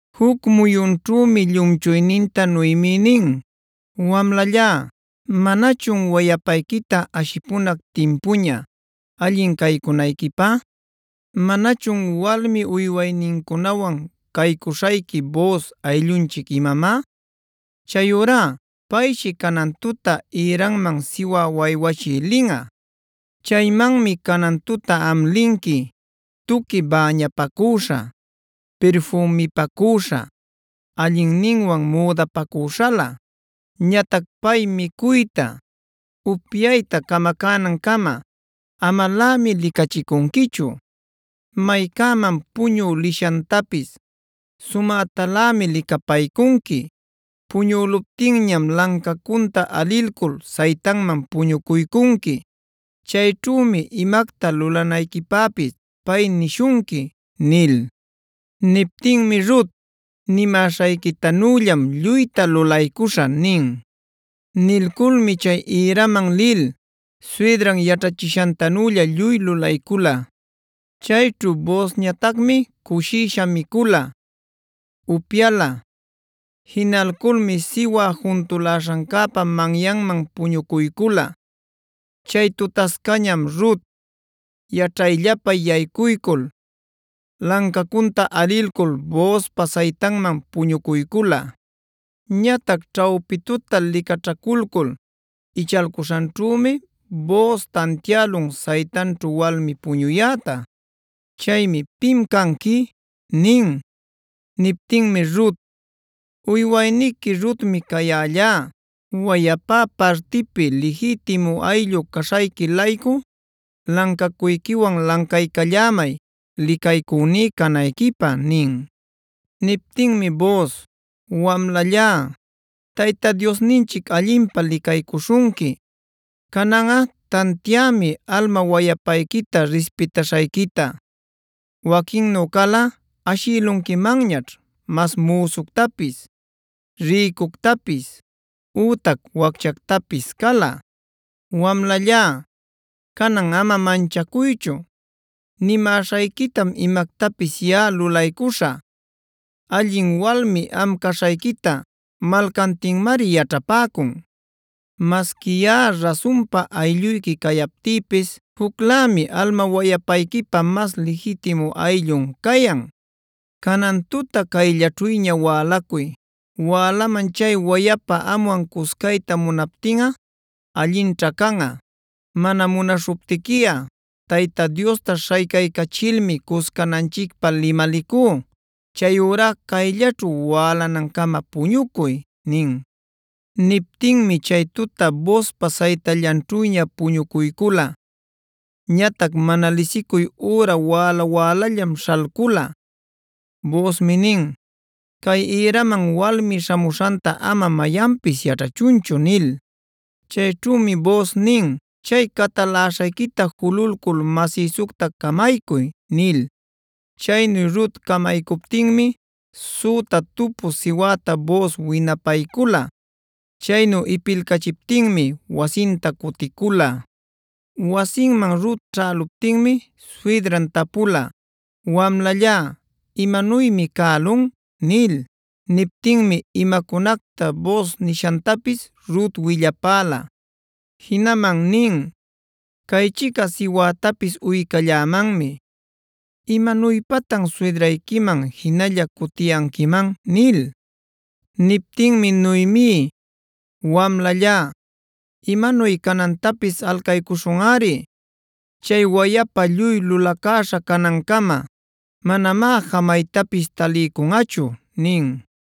Juc muyunćhümi llumchuyninta Noemi nin: “Wamlallá, ¿manachun wayapayquita ashipunac timpuña allin caycunayquipä? ¿Manachun walmi uywaynincunawan caycuśhayqui Booz ayllunchic imamá? Chayurá payshi canan tuta ïranman siwä waywachïa linꞌa. Chaymanmi canan tuta am linqui: tuqui bäñapacüśha, pirfümipacüśha, allinninwan müdapacüśhalä. Ñatac pay micuyta, upyayta camacänancama amalämi licachicunquichu. Maycäman puñü lishantapis sumätalämi licapaycunqui. Puñüluptinñam lancacunta alilcul saytanman puñucuycunqui. Chayćhümi imacta lulanayquipäpis pay nishunqui” nil. Niptinmi Rut: “Nimäśhayquitanüllam lluyta lulaycuśhä” nin. Nilculmi chay ïraman lil suydran yaćhachishantanülla lluy lulaycula. Chayćhu Boozñatacmi cushisha micula, upyala. Jinalculmi siwä juntuläśhancäpa manyanman puñucuycula. Chay tutascañam Rut yaćhayllapa yaycuycul, lancacunta alilcul Boozpa saytanman puñucuycula. Ñatac ćhawpi tuta licaćhaculcul ichalcuśhanćhümi Booz tantiälun saytanćhu walmi puñuyäta. Chaymi: “¿Pim canqui?” nin. Niptinmi Rut: “Uywayniqui Rutmi cayällá. Wayapá partipi lijitimu ayllú caśhayqui-laycu lancacuyquiwan lancaycallämay licaycüní canayquipä” nin. Niptinmi Booz: “Wamlallá, Tayta Diosninchic allinpä licaycuśhunqui. Cananꞌa tantiämi alma wayapayquita rispitaśhayquita. Waquinnu calꞌa ashïlunquimanñaćh mas müsuctapis, rïcuctapis, ütac wacchactapis cala. Wamlallá, canan ama manchacuychu. Nimäśhayquitam imactapis yaꞌa lulaycuśhä. Allin walmi am caśhayquita malcantinmari yaćhapäcun. Masqui yaꞌa rasunpa aylluyqui cayaptïpis,b juclämi alma-wayapayquipa mas lijitimu ayllun cayan. Canan tuta caylläćhüña wälacuy. Wälaman chay wayapa amwan cuscayta munaptinꞌa allinćha canꞌa. Mana munaśhuptiquiꞌa Tayta Diosta śhaycaycachilmi cuscananchicpä limalicú. Chayurá cayllaćhu wälanancama puñucuy” nin. Niptinmi chay tuta Boozpa saytallanćhüña puñucuycula. Ñatac mana lisicuy üra wäla-wälallam śhalcula. Boozmi nin: “Cay ïraman walmi śhamuśhanta ama mayanpis yaćhachunchu” nil. Chayćhümi Booz nin: “Chay cataläśhayquita jululcul masïsucta camaycuy” nil. Chaynu Rut camaycuptinmi süta tupuc siwäta Booz winapaycula. Chaynu ipilcachiptinmi wasinta cuticula. Wasinman Rut ćhäluptinmi suydran tapula: “Wamlallá, ¿imanuymi cälun?” nil. Niptinmi imacunacta Booz nishantapis Rut willapäla. Jinaman nin: “Caychica siwätapis uycallämanmi ¿imanuypatan suydrayquiman jinalla cutiyanquiman?” nil. Niptinmi Noemi: “Wamlallá, imanuy canantapis alcaycuśhunꞌari. Chay wayapa lluy lulacäśha canancama, manamá jamaytapis taliycunꞌachu” nin.